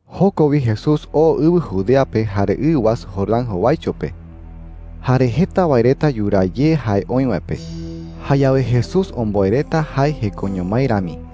Joko wi Jesús oo ɨwɨ Judea pe jare ɨ wasu Jordán jowaicho pe. Jare jeta wae reta yuraa ye jae oï wae pe. Jayawe Jesús omboe reta jae jekoño mái rami.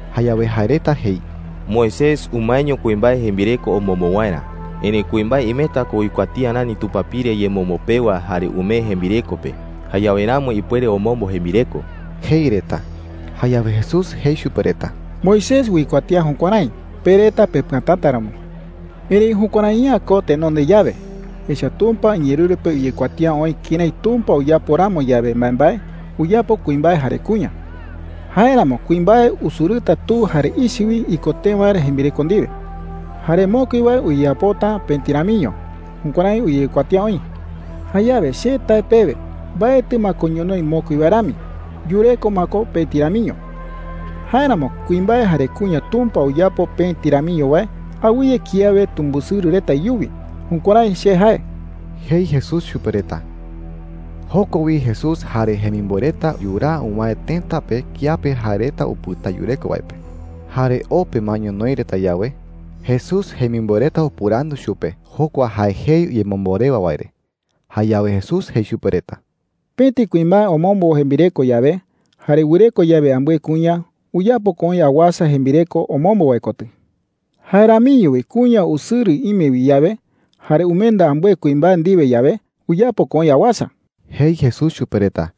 Jayawe jae reta jei: “Moisés umaeño kuimbae jembireko omombo waerä. Erëi kuimbae imeta ko uikuatía rani tupapire yemombo pewa jare umee jembireko pe. Jayawe ramo ipuere omombo jembireko,” jei reta. Jayawe Jesús jei chupe reta: “Moisés uikuatía jukuärái, pe reta pepɨatäta ramo,” jei. “Erëi jukuärai’ä ko tenonde yawe. Echa’ä Tumpa iñeerɨru pe uyekuatía oï kërái Tumpa uyapo ramo yawe mbaembae, uyapo kuimbae jare kuña. ‘Jáeramo kuimbae usɨrɨta tu jare ichɨ wi iko tee waerä jembireko ndiwe. Jare mokui wae uyeyapota pëti ramiño.’ Jukuärái uyekuatía oï,” jei chupe reta. “Jayawe che tae pewe, mbaetɨ ma ko ñonoï mokui wae rami. Yureko ma ko pëti ramiño. Jáeramo kuimbae jare kuña Tumpa uyapo pëti ramiño wae, awɨye kiawe tumbɨsɨrɨ reta iyuwi. Jukuärái che jae,” jei Jesús chupe reta. Joko wi Jesús jare jemimboe reta yuraa uwäe tëta pe kiape jae reta upɨta yureko wae pe. Jare o pe ma ñonoï reta yawe, Jesús jemimboe reta upɨrandu chupe jokua jae jei yemombo rewa wae re. Jayawe Jesús jei chupe reta: “Pëti kuimbae omombo jembireko yawe, jare wɨreko yawe ambɨe kuña, uyapo ko oï awasa jembireko omombo wae kotɨ,” jei chupe reta. “Jae ramiño wi kuña usɨrɨ ime wi yawe, jare umenda ambɨe kuimbae ndiwe yawe, uyapo ko oï awasa,” jei Jesús chupe reta.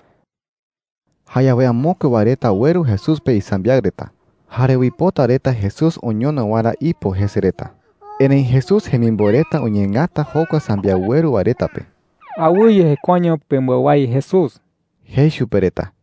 Jayawe amokue wae reta ueru Jesús pe isambiaɨ reta, jare uipota reta Jesús oñono waerä ipo jese reta. Erëi Jesús jemimboe reta uñeengata jokua sambiaɨ ueru wae reta pe. “Awɨye jekuaeño pembɨawái Jesús,” jei chupe reta.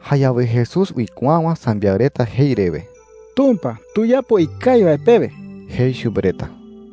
Jayawe Jesús uikuäwa sambiaɨ reta jei rewe: “Tumpa tuyapo ikawi wae pewe,” jei chupe reta.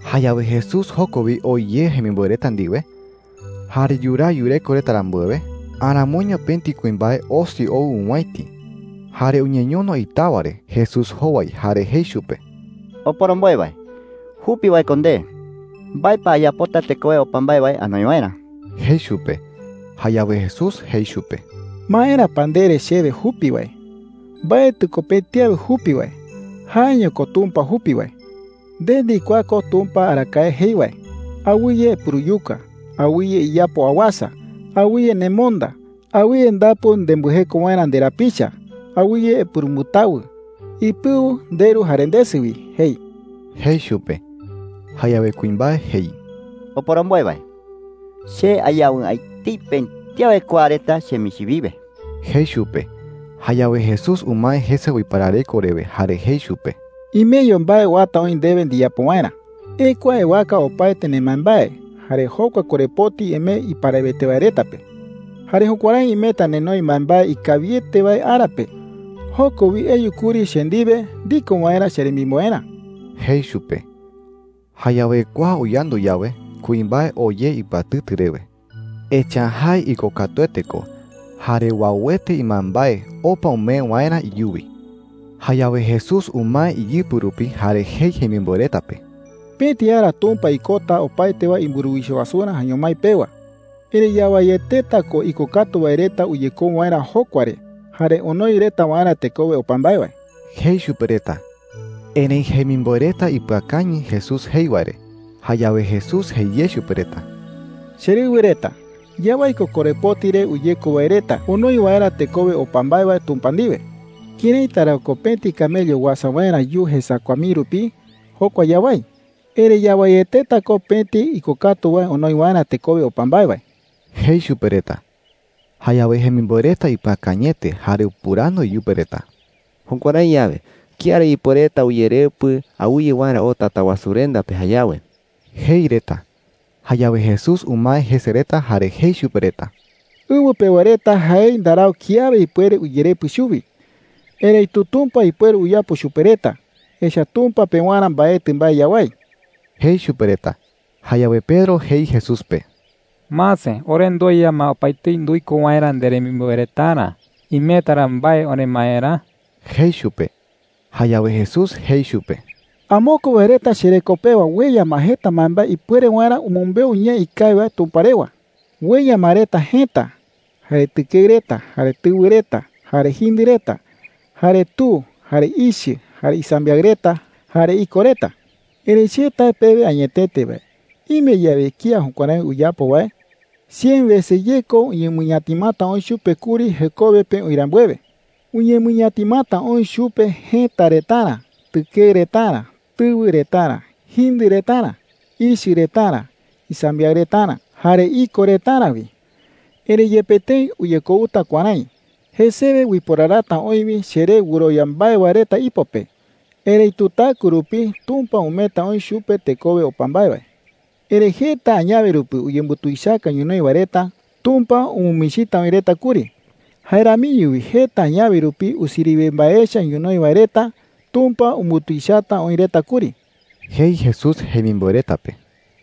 Jayawe Jesús joko wi oo ye jemimboe reta ndiwe. Jare yuraa yureko reta rambuewe, aramoiño pëti kuimbae osi ou owäiti. Jare uñeñono itawa re Jesús jowai jare jei chupe: “Oporomboe wae, jupi wae ko nde. ¿Mbae pa ayapota tekowe opa mbae wae anoi waerä?” jei chupe. Jayawe Jesús jei chupe: “¿Maera pa ndere chewe jupi wae? Mbaetɨ ko pëti awe jupi wae. Jaeño ko Tumpa jupi wae,” jei. “Nde ndikuaa ko Tumpa arakae jei wae: ‘Awɨye epuruyuka. Awɨye iyapo awasa. Awɨye nemonda. Awɨye ndapu nembɨjeko waerä nderapicha. Awɨye epurumbɨtawɨ. Ipɨu nderu jare ndesɨ wi,’ jei,” jei chupe. Jayawe kuimbae jei: “Oporomboe wae, che ayawɨ'ä etei pëti awe kua reta chemichi wiwe,” jei chupe. Jayawe Jesús umae jese uiparareko rewe jare jei chupe: “Imeño mbae uata oï ndewe ndiyapo waerä,” jei chupe. “Ekua ewaka opaete nembaembae, jare jokua korepoti emee iparawete wae reta pe. Jare jukuärái imeta nenoi mbaembae ikawiete wae ara pe. Joko wi eyu kuri che ndiwe ndiko waerä cheremimboerä,” jei chupe. Jayawe kua uyandu yawe, kuimbae oo ye ipɨatɨtɨ rewe. Echa’ä jae ikokatuete ko jare uauete imbaembae opa umee waerä iyuwi. Jayawe Jesús umae iyɨpɨ rupi, jare jei jemimboe reta pe: “Pëti ara Tumpa ikota opaete wae imburuwicha wasurä jaeño mái pewa. Erëi yawaieteta ko ikokatu wae reta uyekou waerä jokua re jare onoi reta waerä tekowe opa mbae wae,” jei chupe reta. Erëi jemimboe reta ipɨakañɨ Jesús jei wae re. Jayawe Jesús jei ye chupe reta: “Cherɨwɨ reta, yawái ko korepoti re uyeko wae reta onoi waerä tekowe opa mbae wae Tumpa ndiwe,” jei. “¿Këraita ra ko pëti camello Pëti camello tuichaete kawayu wi. uasa waerä yuu jesakua mii rupi? Jokua yawái. Erëi yawaieteta ko pëti ikokatu wae onoi waerä tekowe opa mbae wae,” jei chupe reta. Jayawe jemimboe reta ipɨakañɨete, jare upɨrandu iyupe reta: “Jukuärái yawe, ¿kía ra ipuereta uyerepɨ awɨye waerä oo Tatawasurenda pe jayawe?” jei reta. Jayawe Jesús umae jese reta, jare jei chupe reta: “Ɨwɨ pewa reta jaei ndarau kiawe ipuere uyerepɨ chuwi. Erëitu Tumpa ipuere uyapo chupe reta, echa’ä Tumpa pewarä mbaetɨ mbae yawái,” jei chupe reta. Jayawe Pedro jei Jesús pe: “Mase, ore ndueya ma opaetei nduiko waerä nderemimboe retarä. ¿Imeta ra mbae oremaerä?” jei chupe. Jayawe Jesús jei chupe: “Amokue wae reta chereko pewa ueya ma jeta mbaembae ipuere waerä umɨmbeu ñee ikawi wae Tumpa rewa. Ueya ma reta jëta, jare tɨkeɨ reta, jare tɨwɨ reta, jare jindɨ reta, jare tu, jare ichɨ, jare isambiaɨ reta, jare iko reta. Erëi che tae pewe añetete wae, ime yawe kía jukuärái uyapo wae, cien wese ye ko uñemɨñatimata oï chupe kuri jekowe pe oï rambuewe,” jei chupe reta. “Uñemɨñatimata oï chupe jëta retarä, tɨkeɨ retarä, tɨwɨ retarä, jindɨ retarä, ichɨ retarä, isambiaɨ retarä, jare iko retarä wi. Erëi yepe tëi uyekouta kuärái, jesewe uiporarata oï wi cheré wɨrowia mbae wae reta ipo pe. Erëitu taɨkue rupi Tumpa umeeta oï chupe tekowe opa mbae wae,” jei. “Erëi jeta añawe rupi uyembutuichaka ñonoï wae reta, Tumpa umɨmichita oï reta kuri. Jae ramiño wi jeta añawe rupi usiriwe mbae echa ñonoï wae reta, Tumpa umbutuichata oï reta kuri,” jei Jesús jemimboe reta pe.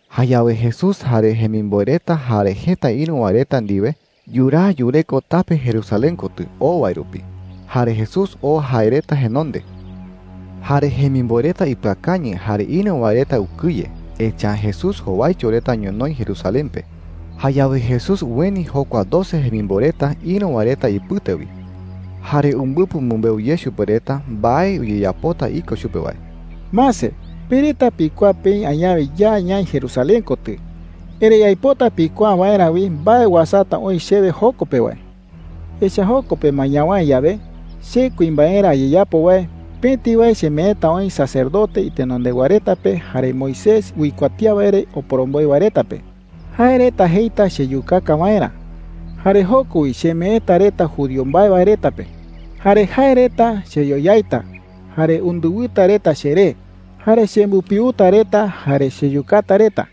Jayawe Jesús jare jemimboe reta jare jeta ïru wae reta ndiwe yuraa yureko tape Jerusalén kotɨ oo wae rupi, jare Jesús oo jae reta jenonde. Jare jemimboe reta ipɨakañɨ jare ïru wae reta ukɨye, echa’ä Jesús jowaicho reta ñonoï Jerusalén pe. Jayawe Jesús ueni jokua doce jemimboe reta ïru wae reta ipɨte wi. Jare umbɨpɨ umɨmbeu ye chupe reta mbae uyeyapota iko chupe wae. “Mase, pe reta pikuaa peï añawe ya ñaï Jerusalén kotɨ. Erëi aipota pikuaa waerä wi mbae uasata oï chewe joko pe wae,” jei chupe reta. “Echa’ä joko pe ma ñawäe yawe, che kuimbaerä ayeyapo wae, pëti wae chemeeta oï sacerdote itenondewa reta pe jare Moisés uikuatía wae re oporomboe wae reta pe. Jae reta jeita cheyukaka waerä, jare joko wi chemeeta reta judío mbae wae reta Judío mbae wae reta jae’ä ko Israel iñemoñaa reta. pe,” jei. “Jare jae reta cheyoyaita, jare undɨwɨta reta cheré, jare chembɨpiuta reta, jare cheyukata reta,”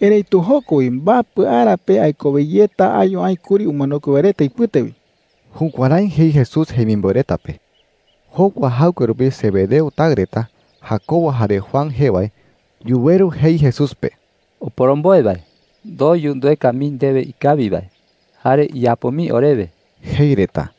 jei. “Erëitu joko wi mbapɨ ara pe aikowe yeta ayu aï kuri umanokue wae reta ipɨte wi.” Jukuärái jei Jesús jemimboe reta pe. Jokua jaɨkue rupi Zebedeo taɨ reta, Jacobo jare Juan jee wae, yuweru jei Jesús pe: “Oporomboe wae,” jei reta. “Ndoyu ndueka mii ndewe ikawi wae, jare iyapo mii orewe,” jei reta.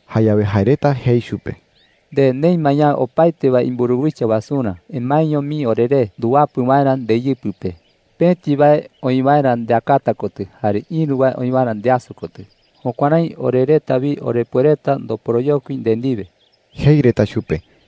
Jayawe jae reta jei chupe: “Nde neï ma yawe opaete wae imburuwicha wasurä, emaeño mii oreré nduwapɨ waerä ndeyɨpɨ pe, pëti wae oï waerä ndeakata kotɨ jare ïru wae oï waerä ndeaso kotɨ. Jukuärái ore reta wi orepuereta ndoporoyokui nde ndiwe,” jei reta chupe.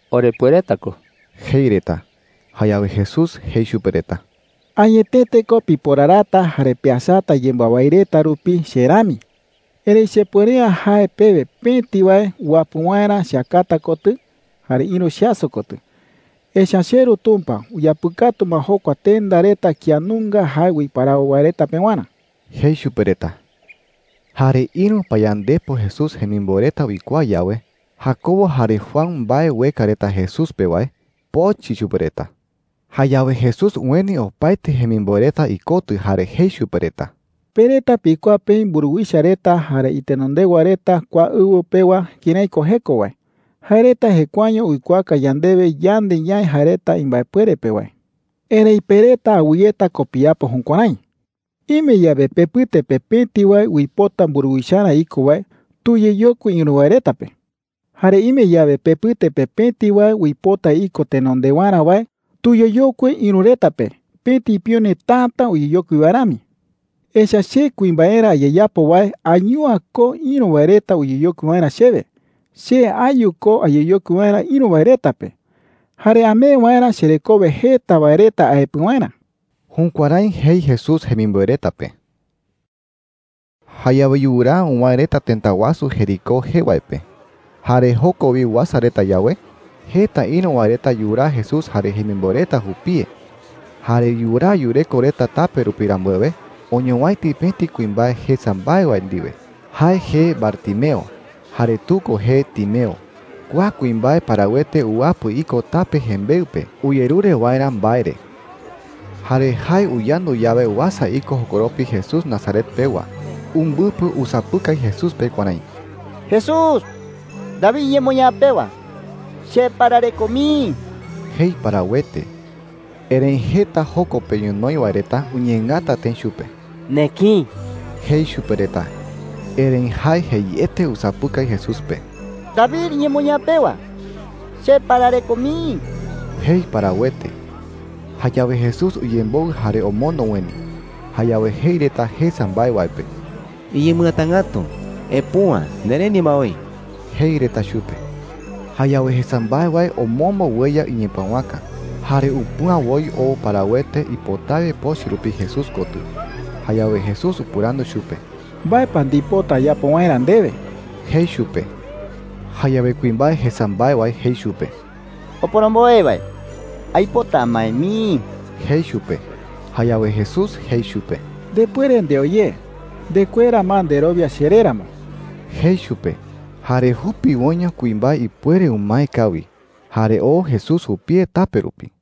“Orepuereta ko,” jei reta. Jayawe Jesús jei chupe reta: “Añetete ko piporarata jare peasata yembɨawái reta rupi che rami,” jei. “Erëi chepuere’ä jae pewe pëti wae uwapɨ waerä cheakata kotɨ jare ïru cheaso kotɨ. Echa’ä cheRu Tumpa uyapɨkatu ma jokua tenda reta kía nunga jae uiparawo wae reta pewarä,” jei chupe reta. Jare ïru payandepo Jesús jemimboe reta uikuaa yawe Jacobo jare Juan mbae ueka reta Jesús pe wae, pochɨ chupe reta. Jayawe Jesús ueni opaete jemimboe reta ikotɨ jare jei chupe reta: “Pe reta pikuaa peï mburuwicha reta jare itenondewa reta kua ɨwɨ pewa kërái ko jeko wae. Jae reta jekuaeño uikuaaka yandewe yande ñaï jae reta imbaepuere pe wae. Erëi pe reta awɨyeta ko piyapo jukuärái,” jei. “Ime yawe pepɨte pe pëti wae uipota mburuwicharä iko wae, tuyeyokui ïru wae reta pe. Jare ime yawe pepɨte pe pëti wae uipota iko tenondewarä wae, tuyeyokui ïru reta pe pëti pione täta uyeyokui wae rami,” jei. “Echa’ä che kuimbaerä ayeyapo wae ayu’ä ko ïru wae reta uyeyokui waerä chewe. Che ayu ko ayeyokui waerä ïru wae reta pe jare amee waerä cherekowe jeta wae reta aepɨ waerä.” Jukuärái jei Jesús jemimboe reta pe. Jayawe yuraa uwäe reta tëta wasu Jericó jee wae pe. Jare joko wi uasa reta yawe, jeta ïru wae reta yuraa Jesús jare jemimboe reta jupie. Jare yuraa yureko reta tape rupi rambuewe, oñowäiti pëti kuimbae jesa mbae wae ndiwe. Jae jee Bartimeo, jare tu ko jee Timeo. Kua kuimbae parawete uwapɨ iko tape jembeɨ pe uyerure waerä mbae re. Jare jae uyandu yawe uasa iko jokoropi Jesús Nazaret pewa, umbɨpɨ usapɨkai Jesús pe kuärái: “Jesús, David iñemoñaa pewa, cheparareko mii,” jei parawete. Erëi jeta joko pe ñonoï wae reta uñeengata tëi chupe. “Nekïi,” jei chupe reta. Erëi jae jeiete usapɨkai Jesús pe: “David iñemoñaa pewa, cheparareko mii,” jei parawete. Jayawe Jesús uyemboɨ jare omondo ueni. Jayawe jei reta jesa mbae wae pe: “Iñemɨatangätu. Epüa. Nereni ma oï,” jei reta chupe. Jayawe jesa mbae wae omombo ueya iñepëwaka, jare upüa woi oo parawete ipotawe pochɨ rupi Jesús kotɨ. Jayawe Jesús upɨrandu chupe: “¿Mbae pa ndipota ayapo waerä ndewe?” jei chupe. Jayawe kuimbae jesa mbae wae jei chupe: “Oporomboe wae, aipota amae mii,” jei chupe. Jayawe Jesús jei chupe: “Ndepuere ndeo ye. Ndekuera ma nderowia cheré ramo,” jei chupe. Jare jupiwoiño kuimbae ipuere umae kawi, jare oo Jesús jupie tape rupi.